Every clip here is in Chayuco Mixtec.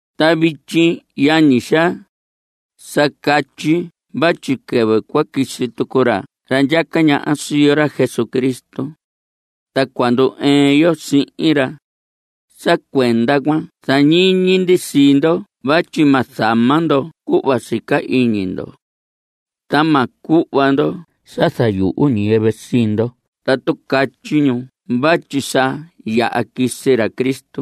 Ta vityi, yañi xaa, sa catyi vatyi quɨvɨ cua quisi tucu ra ndyaca ñaha sii yo, ra Jesucristo, ta cua ndu‑ɨɨn yo sihin ra, sa cuenda cuan zañiñi ndi sii ndo vatyi ma zama ndo cuhva sica iñi ndo. Ta ma cuhva ndo sa zayuhu ñiyɨvɨ sii ndo tatu catyi ñu vatyi sa yaha quisi ra Cristo,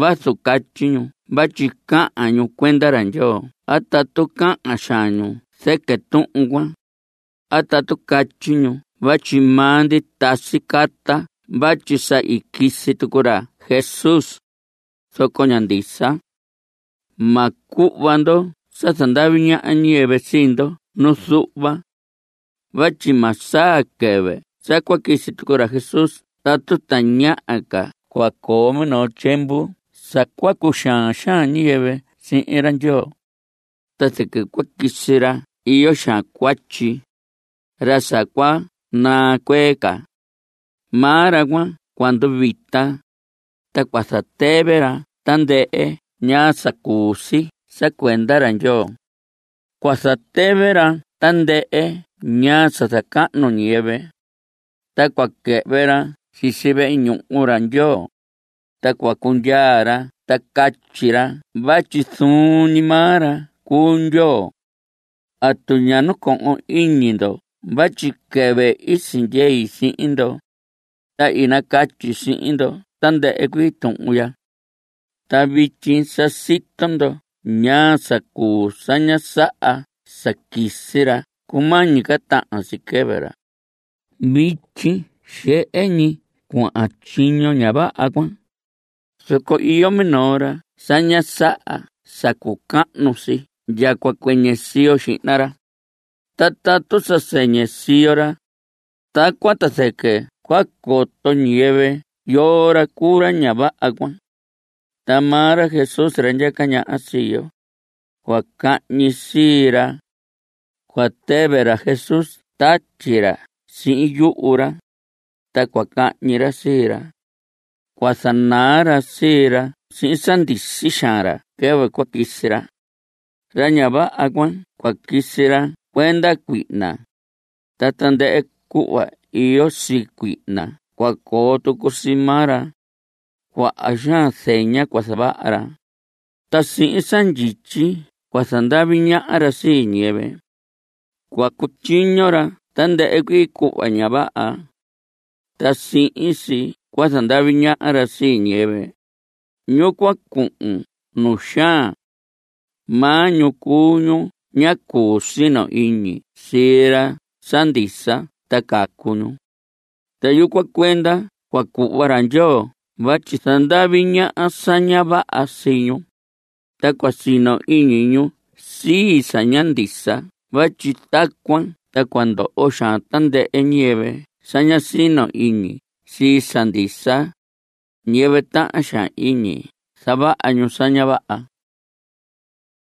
vazu catyi ñu vatyi cahan ñu cuenda ra Ndyoo a tatu cahan xaan ñu zɨquɨ tuhun cuan, a tatu catyi ñu vatyi maa ndi tasi carta vatyi sa i quisi tucu ra Jesús, zoco ña ndisa. Ma cuhva ndo sa zandavi ñaha ñiyɨvɨ sii ndo nu zuhva. Vatyi ma saa quɨvɨ sa cua quisi tucu ra Jesús tatu tañaha ca cua coo minoo tyiemvu sa cua cuxaan xaan ñiyɨvɨ sihin ra Ndyoo. Ta zɨquɨ cua quisi ra iyo xaan cuatyi, ra sa cua naa cuee ca. Maa ra cuan cua nduvita, ta cua zatɨvɨ ra tandɨhɨ ñaa sa cuu si sa cuenda ra Ndyoo. Cua zatɨvɨ ra tandɨhɨ ñaa sa zacahnu ñiyɨvɨ. Ta cua quɨhvɨ ra sisi vehe ñuhu ra Ndyoo, ta cua cundyaa ra ta catyi ra vatyi zuun ñi maa ra cuu Ndyoo. ¿Atu ña nacohon iñi ndo vatyi quɨvɨ i sindyei sihin ndo, ta i nacatyi sihin ndo tandɨhɨ cuii tuhun ya? Ta vityi sa sito ndo ñaa sa cuu sa ña saha sa quisi ra cumañi ca tahan si quɨvɨ ra. Vityi xehe ñi cuahan tyiño ña vaha cuan, zoco iyo minoo ra sa ña saha sa cucahnu si ndya cua cuɨñɨ siyo xihna ra. Ta tatu sa sɨñɨ siyo ra, tacuan ta zɨquɨ cua coto ñiyɨvɨ yoo ra cuu ra ña vaha cuan. Ta maa ra Jesús, ra ndyaca ñaha sii yo, cua cahñi sii ra. Cua tɨvɨ ra Jesús tatyi ra sihin yuhu ra, ta cua cahñi ra sii ra. Cua zanaa ra sii ra sihin sa ndisi xaan ra quɨvɨ cua quisi ra. Ra ña vaha cuan cua quisi sa cuenda cuihna, ta tandɨhɨ cuhva iyo sii cuihna cua coo tucu sii maa ra. Cuaha xaan zeña cua zavaha ra, ta sihin sa ndyityi cua zandavi ñaha ra sii ñiyɨvɨ. Cua cutyiño ra tandɨhɨ cuii cuhva ña vaha. Ta sihin si cua zandavi ñaha ra sii ñiyɨvɨ, ñu cua cuhun nu xaan. Maa ñu cuu ñu ña cuñi sino iñi sii sa ndisa ta cacu ñu. Ta yucuan cuenda cua cuhva ra Ndyoo vatyi zandavi ñaha sa ña vaha sii ñu, ta cua sino iñi ñu sii sa ña ndisa vatyi tacuan ta cua ndoho xaan tandɨhɨ ñiyɨvɨ sa ña sino iñi sii sa ndisa, ñiyɨvɨ tahan xaan iñi zavaha ñu sa ña vaha.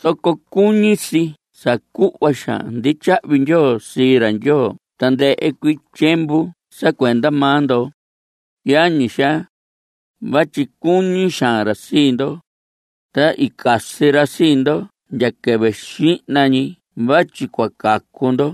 Zoco cuñi si sa cuhva xaan ndi tyahvi ndyoo sii ra Ndyoo tandɨhɨ cuii tyiemvu sa cuenda maa ndo, yañi xaa, vatyi cuñi xaan ra sii ndo, ta i casi ra sii ndo ndya quɨvɨ xihna ñi vatyi cua cacu ndo.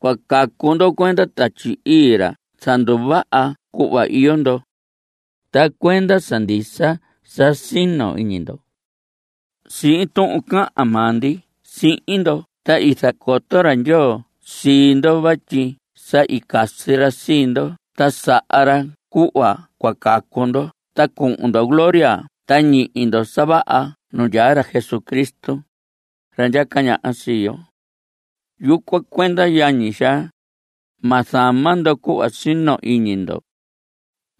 Cua cacu ndo cuenda Tatyi Ii, ra zanduvaha cuhva iyo ndo, ta cuenda sa ndisa sa sino iñi ndo. Sihin tuhun cahan maa ndi sihin ndo ta i zacoto ra Ndyoo sii ndo vatyi sa i casi ra sii ndo ta saha ra cuhva cua cacu ndo ta cuhun ndo gloria ta ñihi ndo sa vaha nu ndyaa ra Jesucristo, ra ndyaca ñaha sii yo. Yucuan cuenda, yañi xaa, ma zama ndo cuhva sino iñi ndo.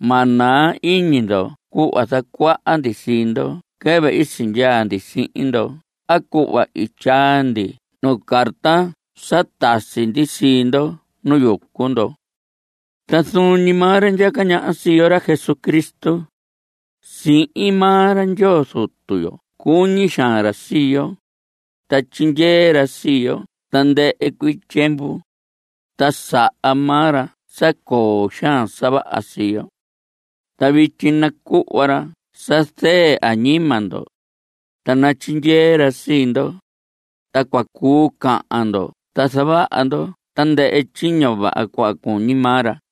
Ma naa iñi ndo cuhva zacuaha ndi sii ndo quɨvɨ i sindyaa ndi sihin ndo a cuhva i tyaa ndi nuu carta sa tasi ndi sii ndo nu yucu ndo. Ta zuun ñi maa ra ndyaca ñaha sii yo, ra Jesucristo, sihin maa ra Ndyoo Zutu yo cuñi xaan ra sii yo, ta tyindyee ra sii yo tandɨhɨ cuii tyiemvu, ta saha maa ra sa coo xaan sa vaha sii yo. Ta vityi nacuhva ra sa zɨɨ añima ndo, ta natyindyee ra sii ndo, ta cua cuu cahan ndo ta zavaha ndo tandɨhɨ tyiño vaha cuhva cuñi maa ra.